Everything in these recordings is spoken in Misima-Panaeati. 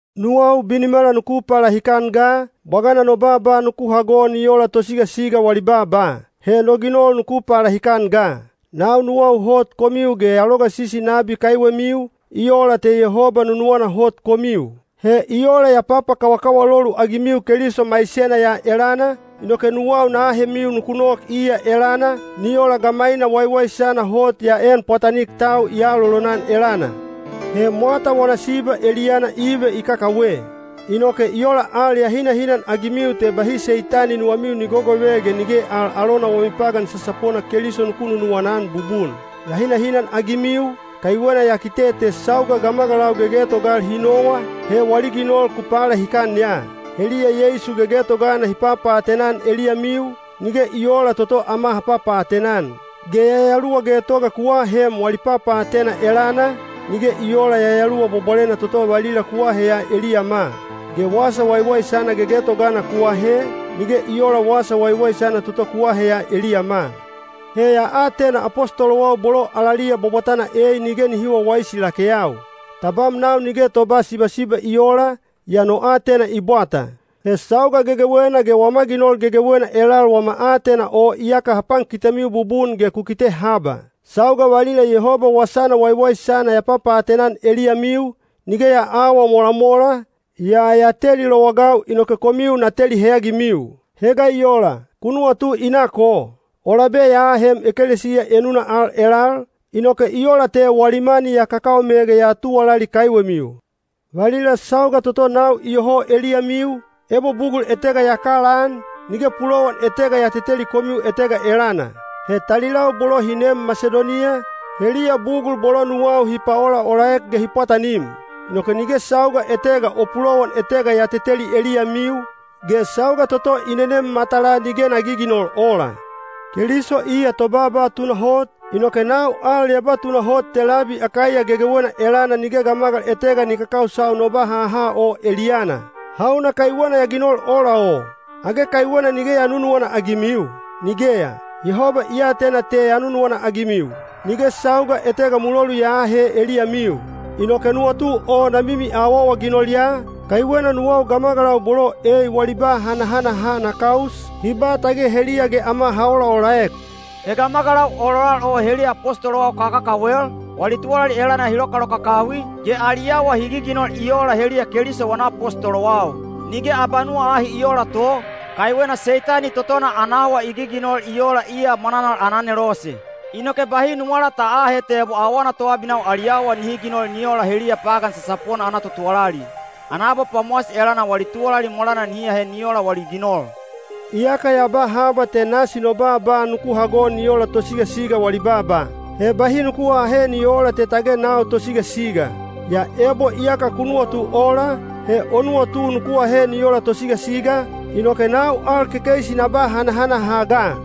Nuwau binimala nuku palahikan ga, bwagana no baaba nuku hago ni ola tosigasiga wali baaba. He no ginol nuku palahikan ga! Nau nuwau hot komiu ge ya logasisi nabi kaiwemiu, i ola te Yehoba nunuwana hot komiu. He i ola ya papakawakawalolu-agimiu Keliso maisena ya elana, inoke nuwau na ahemiu nuku nok iya elana, ni ola gamaina waiwaisana hot ya een pwatanik tau i aalolonan elana. He mwata wana siba eliyana Ive i kakawe. Inoke i ola al ya hinahinan-agimiu te bahi Seitani nuwamiu ni gogove ge nige al alona wami pagan sasapona Keliso nuku nunuwana-an bubun. Ya hinahinan-agimiu, kaiwena ya kite te sauga gamagalau gegetogal hi nowa, he wali ginol ku palahikan ya. Heliya Yeisu gegetogana hi papaatena-an eliyamiu, nige i oola toto ama ha papaatena-an. Ge yayaluwa getoga ku ahem wali papaatena elana, nige i oola Yayaluwa Bwabwalena toto valila ku aheya eliyama. Ge wasa waiwaisana gegetogana ku ahe, nige i oola Wasa Waiwaisana toto ku aheya eliyama. He ya atena apostolowau bolo alaliya bwabwatana ei nige nihi wawaisi lakeyau. Tabam nau nige toba sibasiba i oola, yaa no aatena i bwata. He sauga gegewena ge wama ginol gegewena elal wama aatena o iyaka ha pankitemiu bubun ge ku kite haba. Sauga valila Yehoba Wasana Waiwaisana ya papaatena-an eliyamiu, nige ya aawa molamola, yaa ya teli lowagau inoke komiu na teli heyagimiu. He ga i ola, ku nuwatu i nak o? O labe ya ahem ekelesiya enuna al elal, inoke i ola te wali mani ya kakaome ge ya tuwalali kaiwemiu. Valila sauga toto nau iyoho eliyamiu, ebo bugul etega ya kalaan, nige pulowan etega ya teteli komiu etega elana. He talilau bolo hi neem Masidoniya, heliya bugul bolo nuwau hi paolaolaek ge hi pwatanim. Inoke nige sauga etega o pulowan etega ya teteli eliyamiu, ge sauga toto i nenem matalaa nige na giginol ola. Keliso iya tobaaba tunahot, inoke nau al ya ba tunahot te labi Akaiya gegewena elana nige gamagal etega ni kakausau no ba haha o eliyana. Hauna kaiwena ya ginol ola o? Age kaiwena nige ya nunuwana-agimiu? Nigeya! Yehoba i atena te ya nunuwana-agimiu. Nige sauga etega mulolu ya aahe eliyamiu. Inoke nuwatu o na mimi awaawaginol ya, kaiwena nuwau gamagalau bolo ei wali ba hanahanaha na kaus, hi ba tage heliya ge ama ha olaolaek. He gamagalau ololal o heliya apostolowau kakakawel, wali tuwalali elana hi lokalokakawi, ge ali awa hi giginol i oola heliya Keliso wana apostolowau. Nige abanuwa ahi i oola to, kaiwena Seitani totona ana awa i giginol i oola iya mwananal ana anelose. Inoke bahi nuwala ta aahe te ebo awana toabinau ali awa nihi ginol ni ola heliya pagan sasapona ana totuwalali. Ana abapwamowasi elana wali tuwalali molana nihi ahe ni ola wali ginol. Iyaka ya ba haba te nasi no baaba nuku hago ni ola tosigasiga wali baaba. He bahi nuku aahe ni oola te tage nau tosigasiga. Yaa ebo iyaka ku nuwatu ola, he o nuwatu nuku ahe ni ola tosigasiga, inoke nau al kekeisi na ba hanahanaha ga.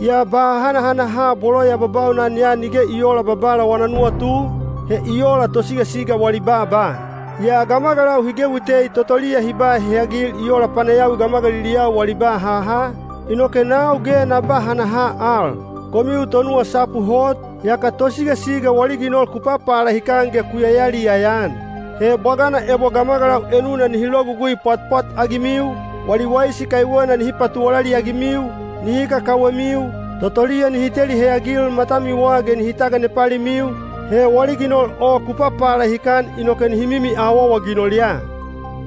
Yaa ba hanahanaha bolo ya babaunan ya nige i oola Babala wana nuwatu, he i ola tosigasiga wali baaba. Yaa gamagalau hi gewi tei totoliya hi ba heyagil i ola panayawi gamagaliliyau wali ba haha, inoke nau ge na ba hanaha al. Komiu tonuwasapu hot, yaka tosigasiga wali ginol ku papalahikan ge ku yayaliyaya-an! He bwagana ebo gamagalau enuna nihi logugui pwatpwat-agimiu, wali waisi kaiwena nihi patuwalali-agimiu, nihi kakawemiu, totoliya nihi teli heyagil matamiwa ge nihi taganepalimiu, he wali ginol o ku papalahikan inoke nihi mimi awaawaginol ya.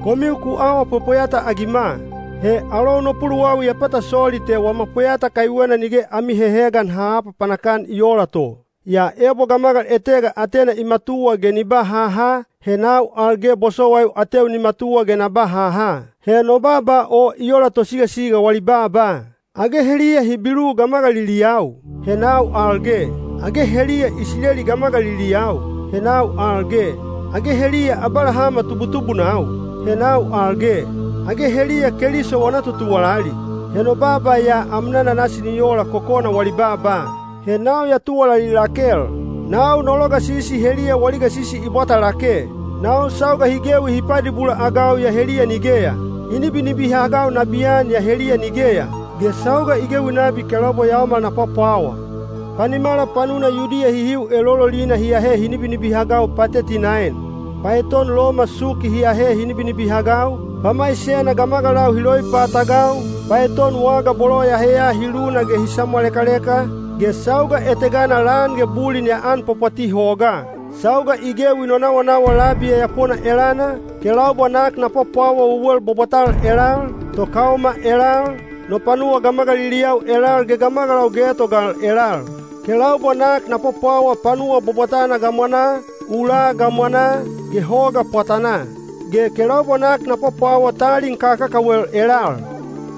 Komiu ku awa pwepweyata-agima. He alou no puluwawi ya pata soli te wama pweyata kaiwena nige ami hehegan ha aapapanak-an i oola to! Yaa ebo gamagal etega atena i matuwa ge ni ba haha, he nau al ge bosowaiu ateu ni matuwa ge na ba haha. (He no baaba o i ola tosigasiga wali baaba.) Age heliya Hibilu gamagaliliyau? He nau al ge. Age heliya Isileli gamagaliliyau? He nau al ge. Age heliya Abalahama tubutubunau? He nau al ge. Age heliya Keliso wana totuwalali? (He no baaba ya amnana nasi ni ola kokona wali baaba.) He nau ya tuwalali lakel. Nau no logasisi heliya wali gasisi i bwata lake; nau sauga hi gewi hi padibula-agau yaa heliya nigeya; hi nibinibihagau nabiyan yaa heliya nigeya; ge sauga i gewi nabi kelaubwa yaomal na pwapwawa. Panimala panuna Yudiya hihiu elololina hi ahe hi nibinibihagau pateti naen. Paeton Loma suki hi ahe hi nibinibihagau, pamaisena gamagalau hi loipatagau, paeton waga bolo ya heya hi luna ge hi samwalekaleka, ge sauga etegana lan ge bulin ya anpwapwati hogaa. Sauga i gewi no nawanawa labi yayapona elana, kelaubwa nak na pwapwawa wewel bwabwatal elal, tokaoma elal, no panuwa gamagaliliyau elal ge gamagalau getogal elal. Kelaubwa nak na pwapwawa panuwa bwabwatana gamwanaa, ulaa gamwanaa, ge hoga pwatanaa. Ge kelaubwa nak na pwapwawa talin kakakawel elal.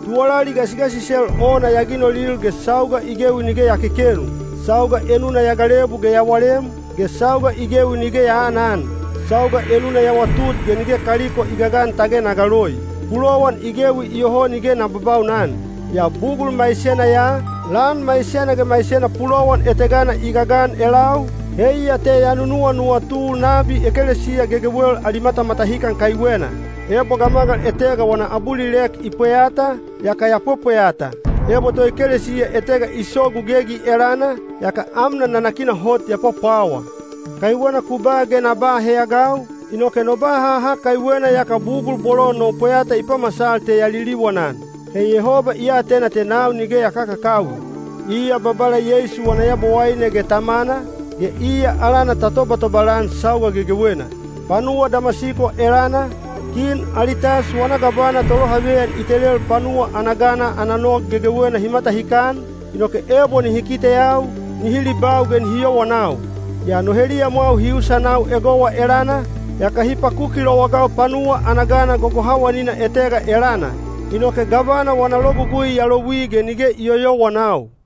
Tuwalali gasigasisel ona ya ginolil ge sauga i gewi nige ya kekenu; sauga enuna ya galebu ge ya walem, ge sauga i gewi nige ya aanan; sauga enuna ya watut ge nige kaliko i gagan tage na galoi. Pulowan i gewi iyoho nige na babaunan. Yaa bugul maisena ya, lan maisena ge maisena pulowan etegana i gagan elau, heiya te ya nunuwanuwatu nabi ekelesiya gegewel ali matamatahikan kaiwena. Ebo gamagal etega wana abulilek i pweyata, yaka ya pwepweyata. Ebo toekelesiya etega i sogu gegi elana, yaka amnan nanakina hot ya pwapwawa. Kaiwena ku ba ge na ba heyagau, inoke no ba haha kaiwena yaka bugul bolo no pweyata i pamasal te ya liliwanan. He Yehoba i atena te nau nige ya kakakawi. Iya Babala Yeisu wana Yabowaine ge Tamana, ge iya alana ta tobatobal-an sauga gegewena. Panuwa Damasiko elana, Kin Alitas wana gavana tolohaveyan i telel panuwa ana gana ana nog gegewena hi matahikan, inoke ebo nihi kiteyau, nihi libau ge nihi yowanau. Yaa no heliyamwau hi usanau egowa elana, yaka hi pakuki lowagau panuwa ana gana gogohawanina etega elana. Inoke gavana wana logugui ya louwi ge nige i yoyowanau.